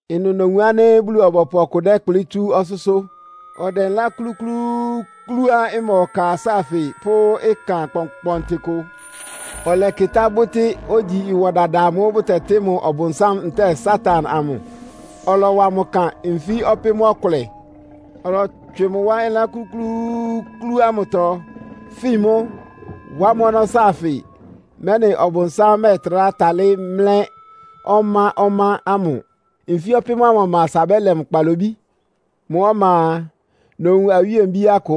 Ɩnʋ nowun ánɩ́ Bulu-ɔbɔpʋ ɔkʋ lɛ́kplɩ́ tsú ɔsʋ́sʋ́. Ɔdɛ ɩlán klúklúúklúá ɩma ɔka sáafɩ pʋ́ ɩkan kpɔnkpɔntɩ kʋ. Ɔlɛkɩtá bʋ́tɩ́, ogyi ɩwɔ dada amʋ́ʋ́ bʋtɛtɩ́ mʋ Ɔbʋnsám ntɛ́ɛ Satan amʋ, ɔlɔwa mʋ ɩkan nfí ɔpɩ́m-ɔkʋlɛ. Ɔlɔtswɩ mʋ wá ɩlán klúklúúklú ámʋtɔ, fin mʋ́, wá mʋ́ ɔnɔ́ sáafɩ, mɛ́nɩ Ɔbʋnsám mɛ́ɛtrá talɩ́ mlɛ́ ɔmá-ɔmá ámʋ. Nfí ɔpɩ́m ámʋ ɔma asa bɛ́lɛ mʋ kpalobí. Mʋ́ ɔma a, nowun awíe-mbíá kʋ.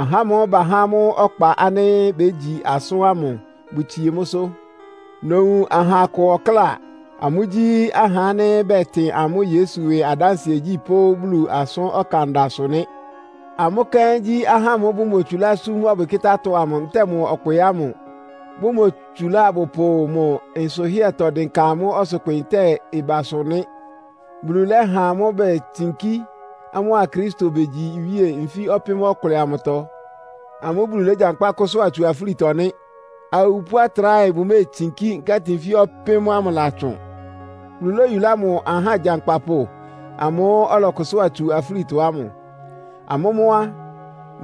Ahá ámʋ́ʋ́ bahá amʋ́ ɔkpa ánɩ́ bégyi asʋ́n ámʋ bʋtsie mʋ́sʋ́. Nowun aha akʋ ɔkláa. Amʋ́gyí ahá ánɩ́ bɛtɩn amʋ́ Yesu ɩwɩ adánsɩɛgyí pʋ́ Bulu asʋ́n ɔkanda sʋ́ nɩ́. Amʋ́ kɛ́n gyí ahá ámʋ́ʋ́ bʋmotsulá súm ɔbwɩkɩ́tá-atɔ amʋ ntɛ́ɛ mʋ ɔkpɩ ámʋ, bʋmotsúlá abʋpʋ mʋ nsʋhɩ́ɛtɔ dɩnka amʋ́ ɔsʋkpɩ ntɛ́ɛ amʋ́ ɩbasʋ nɩ́. Bulu lɛ́ha amʋ́ betsinkí, amʋ́a Kristo begyi iwíe nfí ɔpɩ́m-ɔkʋlɛ amʋtɔ. Amʋ́ Bulu légyankpá kʋ́sʋ́a tsú afúlitɔ nɩ́. (Awupʋ́ atráhɛ bʋméetsinkí, nkɛ́tɩ nfí ɔpɩ́m ámʋ ɩlatsʋn.) Bulu lóyulá mʋ aha agyankpapʋ amʋ́ʋ́ ɔlɔkʋsʋ́a tsu afúlitɔ amʋ. Amʋ́ mʋ́ á,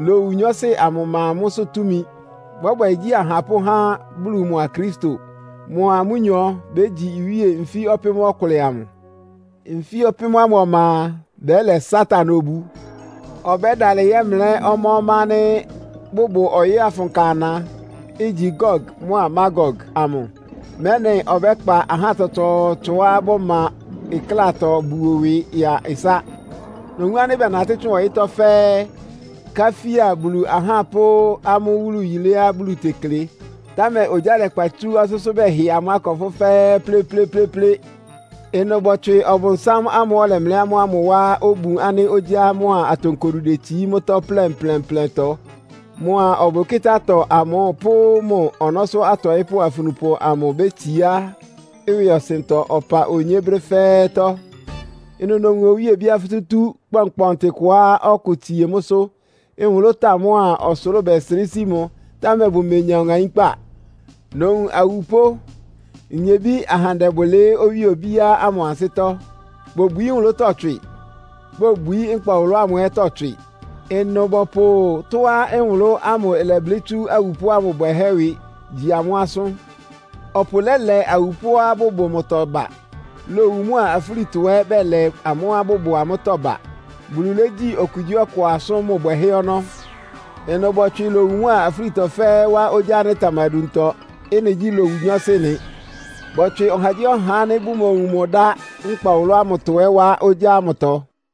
lowu nyɔɔsɩ amʋ ɩma amʋ́sʋ́ túmi. Bɔ́bwɛ igyí ahapʋ́ há Bulu mʋa Kristo, mʋa amʋ́nyɔ bégyi iwíe nfí ɔpɩ́m-ɔkʋlɛ amʋ. Nfí ɔpɩ́m ámʋ ɔma a, bɛ́lɛ Satan obu. Ɔbɛ́dalɩ yɛ́mlɛ́ ɔmá-ɔmá ánɩ́ bʋbʋ ɔyɩ́ afʋnka ana, igyi Gog mʋ́a Magog amʋ, mɛ́nɩ ɔbɛ́kpa ahá tsɔtsɔɔtsɔá bʋma ɩklátɔ buo ɩwɩ ya ɩsá. Nowun ánɩ́ bɛnatɩ́ tsʋn ɔyɩ́tɔ́ fɛ́ɛ́, káfía Bulu ahá pʋ́ amʋ́ wúlu yiléá Bulu tekle, támɛ ogyá lɛkpa tsú ɔsʋ́sʋ́ bɛhɩ amʋ́ akɔpʋ́ fɛ́ɛ́ plɩ́plɩ́plɩ́plɩ́. Ɩnʋ bɔtswɩ Ɔbʋnsám ámʋ́ʋ́ ɔlɛmlɛ́ amʋ́ ámʋ wá obun ánɩ́ ogyá mʋ́a atonkodu detsií mʋ́tɔ́ plɛnplɛnplɛntɔ. Mʋa ɔbwɩkɩ́tá-atɔ amʋ pʋ́ mʋ ɔnɔ́sʋ́ atɔɩ́pʋ́ afunupʋ amʋ bétsiá ɩwɩɔsɩntɔ ɔpa onyé brɛ́ fɛ́ɛ́tɔ́. Ɩnʋ nowun owíe obíá futútú kpɔnkpɔntɩ kʋá ɔkʋ tsie mʋ́sʋ́. Nwʋlʋ́táa mʋ́a ɔsʋlʋ́ʋ bɛsrɩ́ sí mʋ, támɛ bʋmenya ɔŋaínkpá. Nowun awupʋ́, nyebí ahandɛ bʋlɩɩ́ owíe obíá ámʋ ansɩ́tɔ́. Bobwií nwʋlʋ́tɔ́ tswɩ. Bobwií nkpa ɔwʋlʋ́ ámʋ ɛ́tɔ́ tswɩ. Ɩnʋ bɔpʋ tɔ́á nwʋlʋ́ ámʋ ɩlɛblɩ́ tsú awupʋ́ ámʋ bwɛhɛ́ ɩwɩ gyi amʋ́ asʋ́n. Ɔpʋ lɛ́lɛ awupʋ́á bʋbʋ mʋtɔ ba. Lowu mʋa afúlitɔ ɛ́ bɛlɛ amʋ́á bʋbʋ amʋ́tɔ́ ba. Bulu légyi okugyíɔkʋ asʋ́n mʋ bwɛhɛ́ ɔnɔ́. Ɩnʋ bɔtswɩ lowu mʋa afúlitɔ fɛ́ɛ́ wá ogyá ánɩ́ ɩtamaduntɔ. Ɩ́nɩ gyí lowu nyɔɔsɩ nɩ. Bɔtswɩ ɔhagyíɔha ánɩ́ bʋmowun mʋ ɩdá nkpa ɔwʋlʋ́ ámʋtɔ ɛ́ wá ogyá ámʋtɔ.